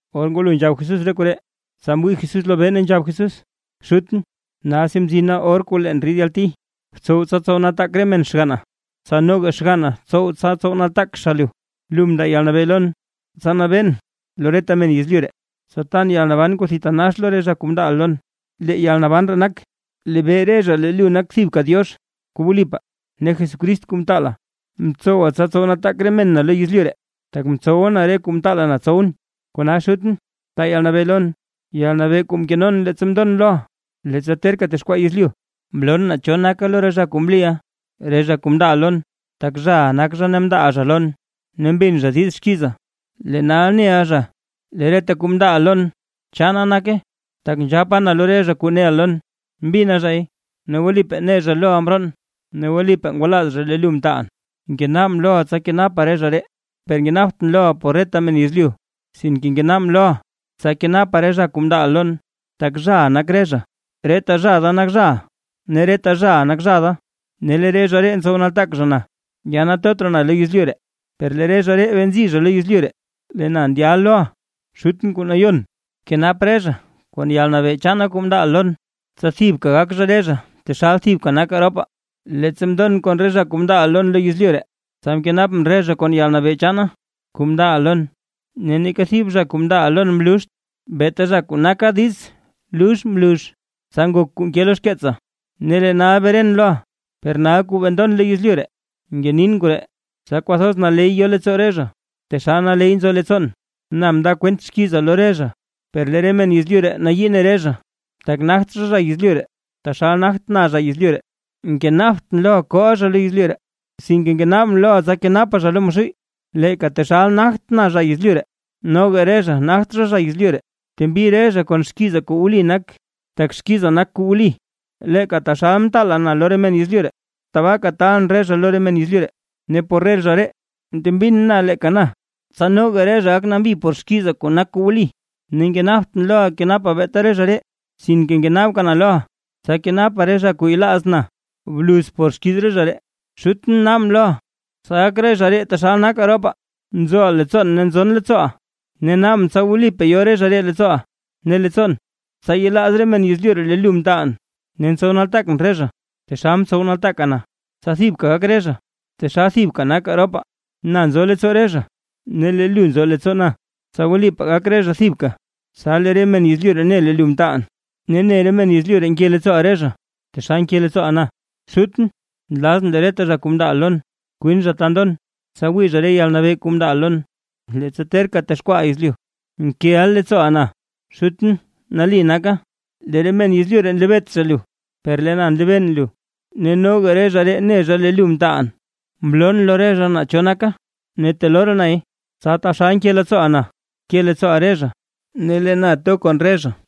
Or ngwalo nzhab Jesús re koree, tsa mwii Jesús lobee, ne nzhab Jesús: ―Xutʼn, nalsi mzina or kuu leen rid yalti, btsow tsa tsow nataak re men xganna. Tsa noga xganna tsow tsa tsow nataak zha lu. Lu mndaa yalnabee lon, tsa nabeen lo reta men yezlyu ree, tsa tan yalnaban kuu thitanax lo re zha kuu mndaaʼa lon. Lee yalnaban ree nak, lebee re zha lee lu nak thibka Diox kuu wlipaa ne Jesucrist kuu mtaala. ’Mtsowa tsa tsow nataak re mena lo yezlyu ree, tak mtsowa na re kuu mtaala na tsowʼn. Kona Xutʼn, taa yalnabee lon, yalnabee kuu mkenon leettsa mndon loʼa, leettsa terka texkwaa yezlyu. ’Mloon naa cho naka lo re zha kuu mliʼa, re zha kuu mndaaʼa lon, tak zhaʼa nak zha ne mndaaʼa zha lon ne mbin zha diiz xkiiza. Lee nal neʼa zha lee reta kuu mndaaʼa lon chaana nake. Tak nzhapa na lo re zha re kuu neʼa lon, mbina zhay ne wlipaa ne zha loʼa mroon ne wlipaa ngwalaaz zha lee lu mtaalʼn. ’Ngenaabʼn loʼa tsa kenapa re zha ree, per ngenaabtʼn loʼa por reta men yezlyu, sinke ngenaabʼn loʼa, tsa kenapa re zha kuu mndaaʼa lon, tak zhaʼa nak re zha. Reta zha da nak zhaʼa ne reta zhaʼa nak zha da, ne lee re zha ree ntsow nataak zha na. ’Ya yetot raa na lo yezlyu ree, per lee re zha ree bee nzi zha lo yezlyu ree, lee na ndyal loʼa Xutʼn kuu nayon, bkenap re zha kon yalnabee chaana kuu mndaaʼa lon, tsa thibka gak zha re zha taxal thibka nakaa ropaa. ’Leettsa mndon kon re zha kuu mndaaʼa lon lo yezlyu ree, tsa mkenapʼn re zha kon yalnabee chaana kuu mndaaʼa lon. Ne neeka thib zha kuu mndaaʼa lon mluuxt, beeta zha kuu naka diiz lux mlux, tsa ngok kuu nke lo xkeetsa. ’Ne lee nal beren loʼa, per nal kuu bee ndon lo yezlyu ree, ngenin koree, tsa kwathoz naley yo leettsoo re zha, taxal naley nzo leettsoon. Na mndaa kwent xkiiza lo re zha, per lee re men yezlyu nayii ne re zha, tak nagt zha zha yezlyu ree, taxal nagt na zha yezlyu ree. Ngenaabtʼn loʼa kooʼa zha lo yezlyu ree, sinke ngenaabʼn loʼa tsa kenapa zha lo Maxuuy. Leeka taxal nagtʼn zha yezlyu ree, noga re zha nagt zha zha yezlyu ree. Btembi re zha kon xkiiza kuu wli nak. Tak xkiiza nak kuu wli. Leeka taxal mtaala na lo re men yezlyu ree, tabaaka taalʼn re zha lo re men yezlyu ree. Ne por re zha ree, ntembin na leeka na, tsa noga re zha gak nambi zha por xkiiza kuu nak kuu wli. ’Ne ngenaabtʼn loʼa kenapa beeta re zha ree, sinke ngenaabka na loʼa tsa kenapa re zha kuu yelaaz na bluz por xkiiz re zha ree. Xutʼn naabʼn loʼa, tsa gak re zha ree taxal nakaa ropaa, nzoʼa leettsoon ne nzon leettsooʼa, ne naabʼn tsa wlipaa yo re zha leettsooʼa ne leettsoon, tsa yelaaz re men yezlyu ree lee lu mtaalʼn. Ne ntsow nataak na re zha, taxal ntsow nataaka na, tsa thibka gak re zha, taxal thibka nakaa ropaa. Na nzo leettsoo re zha ne lu nzo leettsoo na, tsa wlipaa gak re zha thibka, tsa lee re men yezlyu ne lee lu mtaalʼn, ne ne re men yezlyu ree nke leettsooʼa re zha, taxal nke leettsooʼa na. ’Xutʼn, nlazʼn lee reta zha kuu mndaaʼa lon kwin zha ta ndon, tsa wii re zha yalnabee kuu mndaaʼa lon; leettsa terka texkwaaʼa yezlyu, nkeʼa leettsooʼa na. Xutʼn nali naka, lee re men yezlyu ree nlebeet zha lu, per lee na nlebeen lu, ne noga re zha ree ne zha lee lu mtaalʼn. Mloon lo re zha naa cho naka, ne teloo raa nay, tsa taxal nke leettsooʼa na, ke leettsooʼa re zha, ne lee na to kon re zha.